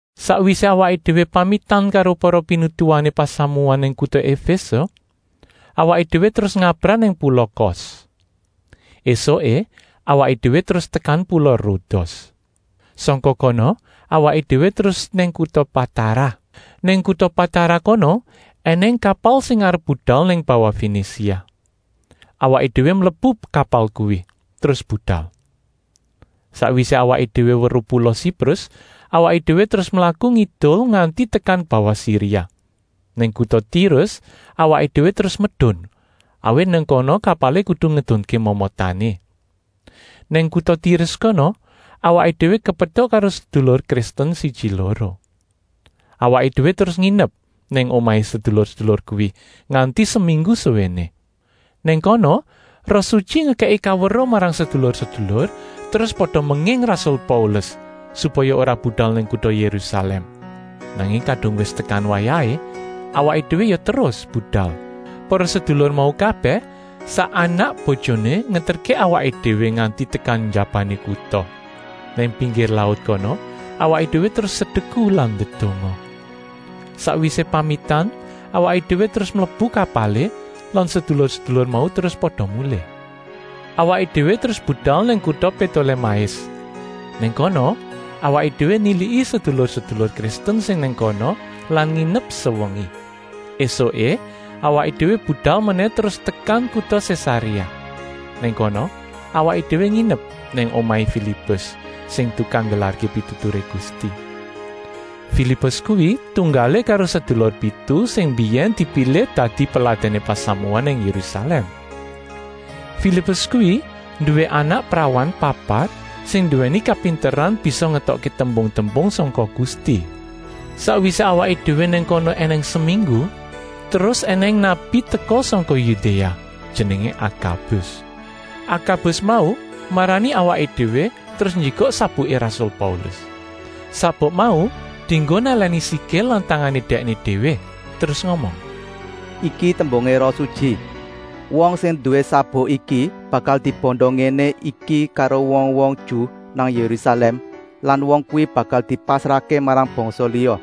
Sakwisé awaké déwé pamitan karo para pinituwané pasamuan nang kuta Efése, awaké déwé terus ngabrah nang pula Kos. Esuké awaké déwé terus tekan pula Rodos. Sangka kono awaké déwé terus nang kuta Patara. Nang kuta Patara kono ènèng kapal sing arep budal nang bawah Fenisia. Awaké déwé mlebu kapal kuwi terus budal. Sakwisé awaké déwé weruh pula Siprus, awaké déwé terus mlaku ngidul nganti tekan bawah Siria. Nang kuta Tirus awaké déwé terus medun, awit nang kono kapalé kudu ngedunké momotané. Nang kuta Tirus kono awaké déwé kepetuk karo sedulur Kristen siji-loro. Awaké déwé terus nginep nang omahé sedulur-sedulur kuwi nganti seminggu suwéné. Nang kono Roh Sutyi ngekèki kaweruh marang sedulur-sedulur, terus pada menging rasul Paulus, supaya ora budal nang kuta Yérusalèm. Nanging kadung wis tekan wayahé awaké déwé ya terus budal. Para sedulur mau kabèh, sak anak-bojoné, ngeterké awaké déwé nganti tekan njabané kuta. Nang pinggir laut kono awaké déwé terus sedeku lan ndedonga. Sakwisé pamitan awaké déwé terus mlebu kapalé lan sedulur-sedulur mau terus pada mulih. Awaké déwé terus budal nang kuta Pétolémais. Nang kono awaké déwé niliki sedulur-sedulur Kristen sing nang kono lan nginep sewengi. Esuké awaké déwé budal menèh terus tekan kuta Sésaréa. Nang kono awaké déwé nginep nang omahé Filipus sing tukang nggelarké pituturé Gusti. Filipus kuwi tunggalé karo sedulur pitu sing mbiyèn dipilih dadi peladèné pasamuan nang Yérusalèm. Filipus kuwi nduwé anak prawan papat sing nduwèni kapinteran bisa ngetokké tembung-tembung sangka Gusti. Sakwisé awaké déwé nang kono ènèng seminggu, terus ènèng nabi teka sangka Yudéa, jenengé Akabus. Akabus mau marani awaké déwé terus njikuk sabuké rasul Paulus. Sabuk mau dienggo nalèni sikil lan tangané dèkné déwé terus ngomong: “Iki tembungé Roh Sutyi: wong sing nduwé sabuk iki bakal dibanda ngéné iki karo wong-wong Ju nang Yérusalèm lan wong kuwi bakal dipasrahké marang bangsa liya.”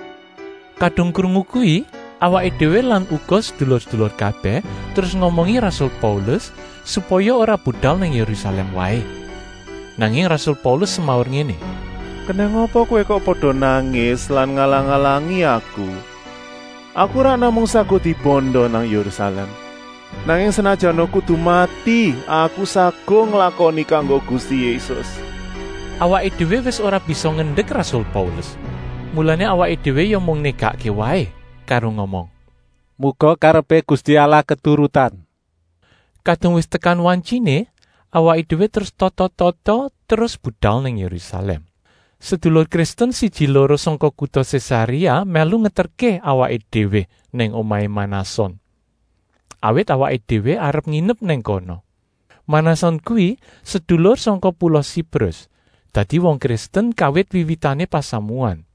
Kadung krungu kuwi, awaké déwé lan uga sedulur-sedulur kabèh terus ngomongi rasul Paulus, supaya ora budal nang Yérusalèm waé. Nanging rasul Paulus semaur ngéné: “Kenèng apa kowé kok pada nangis lan ngalang-alangi aku. Aku ora namung saguh dibanda nang Yérusalèm, nanging senajana kudu mati aku saguh nglakoni kanggo Gusti Yésus.” Awaké déwé wis ora bisa ngendek rasul Paulus, mulané awaké déwé ya mung négakké waé karo ngomong: “Muga karepé Gusti Allah keturutan.” Kadung wis tekan wantyiné, awaké déwé terus tata-tata, terus budal nang Yérusalèm. Sedulur Kristen siji-loro sangka kuta Sésaréa mèlu ngeterké awaké déwé nang omahé Manason, awit awaké déwé arep nginep nang kono. Manason kuwi sedulur sangka pula Siprus, dadi wong Kristen kawit wiwitané pasamuan.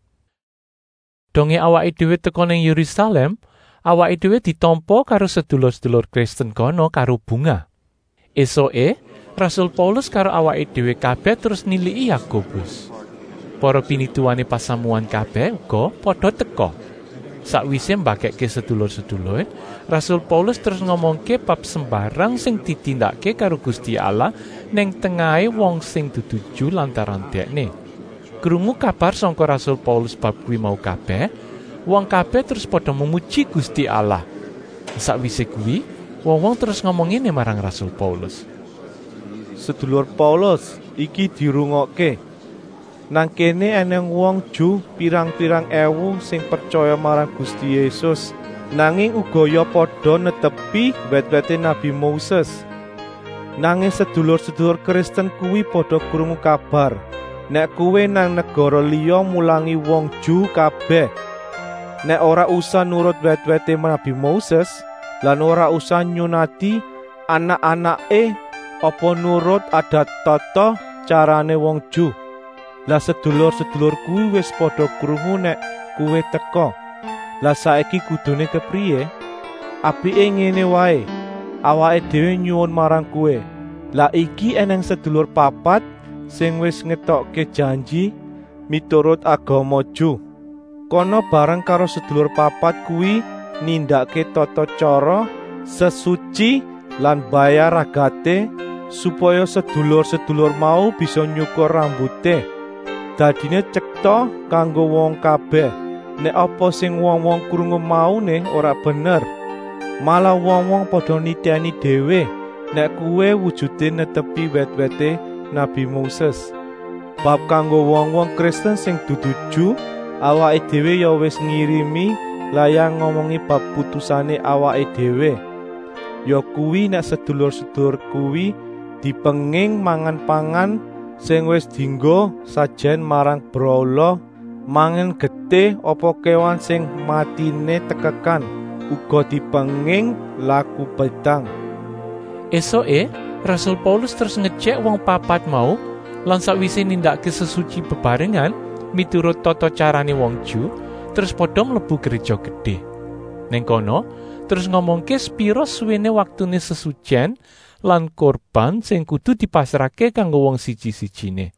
Dongé awaké déwé teka nang Yérusalèm, awaké déwé ditampa karo sedulur-sedulur Kristen kono karo bungah. Esuké rasul Paulus karo awaké déwé kabèh terus niliki Yakobus. Para pinituwané pasamuan kabèh uga pada teka. Sakwisé mbagèkké sedulur-sedulur, rasul Paulus terus ngomongké bab sembarang sing ditindakké karo Gusti Allah nang tengahé wong sing dudu Ju lantaran dèkné. Krungu kabar sangka rasul Paulus bab kuwi mau kabèh, wong kabèh terus pada memuji Gusti Allah. Sakwisé kuwi wong-wong terus ngomong ngéné marang rasul Paulus: “Sedulur Paulus, iki dirungokké. Nang kéné ènèng wong Ju pirang-pirang èwu sing pretyaya marang Gusti Yésus, nanging uga ya pada netepi wèt-wèté nabi Moses. Nanging sedulur-sedulur Kristen kuwi pada krungu kabar, nèk kowé nang negara liya mulangi wong Ju kabèh, nèk ora usah nurut wèt-wèté nabi Moses lan ora usah nyunati anak-anaké apa nurut adat-tata-tyarané wong Ju. Lah sedulur-sedulur kuwi wis pada krungu nèk kowé teka. Lah saiki kuduné kepriyé? “Apiké ngéné waé, awaké déwé nyuwun marang kowé: lah iki ènèng sedulur papat sing wis ngetokké janji miturut agama Ju. Kana bareng karo sedulur papat kuwi nindakké tata-tyara sesutyi lan mbayar ragaté, supaya sedulur-sedulur mau bisa nyukur rambuté. Dadiné tyeta kanggo wong kabèh, nèk apa sing wong-wong krungu mauné ora bener, malah wong-wong pada nitèni déwé, nèk kowé wujuté netepi wèt-wèté nabi Moses. Bab kanggo wong-wong Kristen sing dudu Ju awaké déwé ya wis ngirimi layang ngomongi bab putusané awaké déwé, yakuwi, nèk sedulur-sedulur kuwi dipenging mangan pangan sing wis dienggo sajèn marang brahala, mangan getih apa kéwan sing matiné tekekan; uga dipenging laku bédang.” Esuké rasul Paulus terus ngejèk wong papat mau lan sakwisé nindakké sesutyi bebarengan miturut tata-tyarané wong Ju, terus pada mlebu Gréja Gedé. Nang kono terus ngomongké sepira suwéné waktuné sesutyèn lan kurban sing kudu dipasrahké kanggo wong siji-sijiné.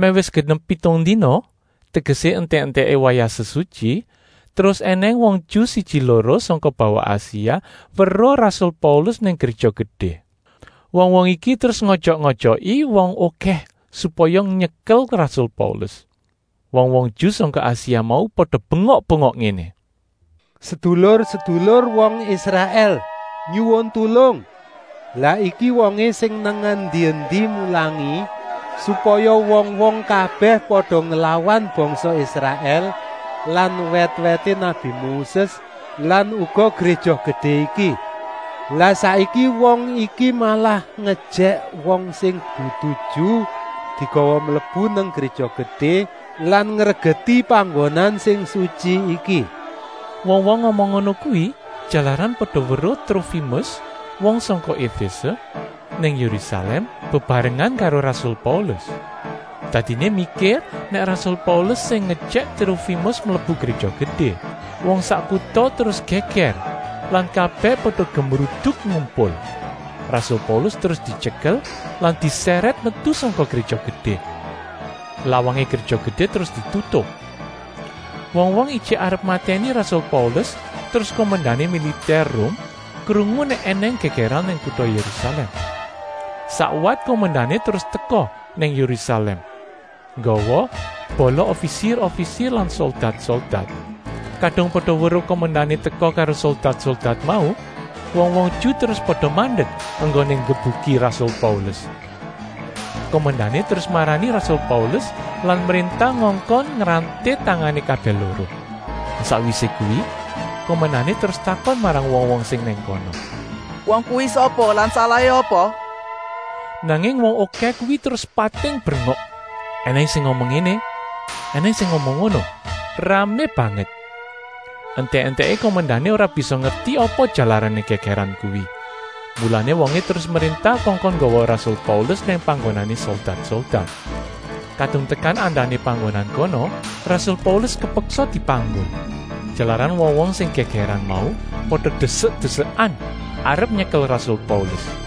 Mèh wis genep pitung dina, tegesé entèk-entèké wayah sesutyi, terus ènèng wong Ju siji-loro sangka bawah Asia weruh rasul Paulus nang Gréja Gedé. Wong-wong iki terus ngojok-ojoki wong okèh, supaya nyekel rasul Paulus. Wong-wong Ju sangka Asia mau pada bengok-bengok ngéné: “Sedulur-sedulur wong Israèl, nyuwun tulung! Lah iki wongé sing nang endi-endi mulangi, supaya wong-wong kabèh pada nglawan bangsa Israèl lan wèt-wèté nabi Moses lan uga Gréja Gedé iki. Lah saiki wong iki malah ngejèk wong sing dudu Ju digawa mlebu nang Gréja Gedé lan ngregeti panggonan sing sutyi iki.” Wong-wong ngomong ngono kuwi jalaran pada weruh Trofimus, wong sangka Efése, nang Yérusalèm, bebarengan karo rasul Paulus. Dadiné mikir nèk rasul Paulus sing ngejèk Trofimus mlebu Gréja Gedé. Wong sak kuta terus gègèr lan kabèh pada gemruduk ngumpul. Rasul Paulus terus dityekel lan disèrèt metu sangka Gréja Gedé. Lawangé Gréja Gedé terus ditutup. Wong-wong ijik arep matèni rasul Paulus terus kumendané militèr Rum krungu nèk ènèng gègèran nang kuta Yérusalèm. Sakwat kumendané terus teka nang Yérusalèm nggawa bala ofisir-ofisir lan soldat-soldat. Kadung pada weruh kumendané teka karo soldat-soldat mau, wong-wong Ju terus pada mandek enggoné nggebuki rasul Paulus. Kumendané terus marani rasul Paulus lan mréntah ngongkon ngranté tangané kabèh loro. Sakwisé kuwi kumendané terus takon marang wong-wong sing nang kono: “Wong kuwi sapa lan salahé apa?” Nanging wong okèh kuwi terus pating brengok, ènèng sing ngomong ngéné, ènèng sing ngomong ngono, ramé banget. Entèk-entèké kumendané ora bisa ngerti apa jalarané gègèran kuwi. Mulané wongé terus mréntah kongkon nggawa rasul Paulus nang panggonané soldat-soldat. Kadung tekan andané panggonan kono rasul Paulus kepeksa dipanggul, jalaran wong-wong sing gègèran mau pada desek-desekan arep nyekel rasul Paulus.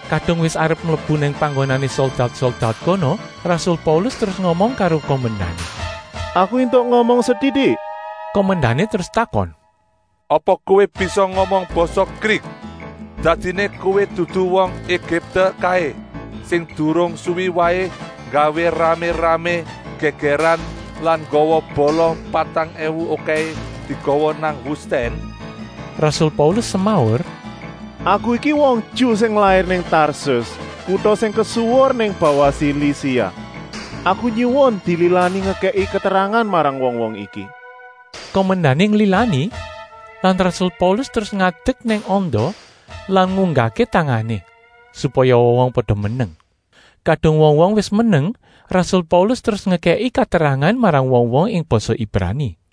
Kadung wis arep mlebu nang panggonané soldat-soldat kono, rasul Paulus terus ngomong karo kumendané: “Aku éntuk ngomong setitik?” Kumendané terus takon: “Apa kowé bisa ngomong basa Grik? Dadiné kowé dudu wong Egipte kaé sing durung suwi waé nggawé ramé-ramé gègèran lan nggawa bala patang èwu okèhé digawa nang wustèn?” Rasul Paulus semaur: “Aku iki wong Ju sing lair nang Tarsus, kuta sing kesuwur nang bawah Silisia. Aku nyuwun dililani ngekèki katerangan marang wong-wong iki!” Kumendané nglilani lan rasul Paulus terus ngadek nang anda lan ngunggahké tangané, supaya wong-wong pada meneng. Kadung wong-wong wis meneng rasul Paulus terus ngekèki katerangan marang wong-wong ing basa Ibrani.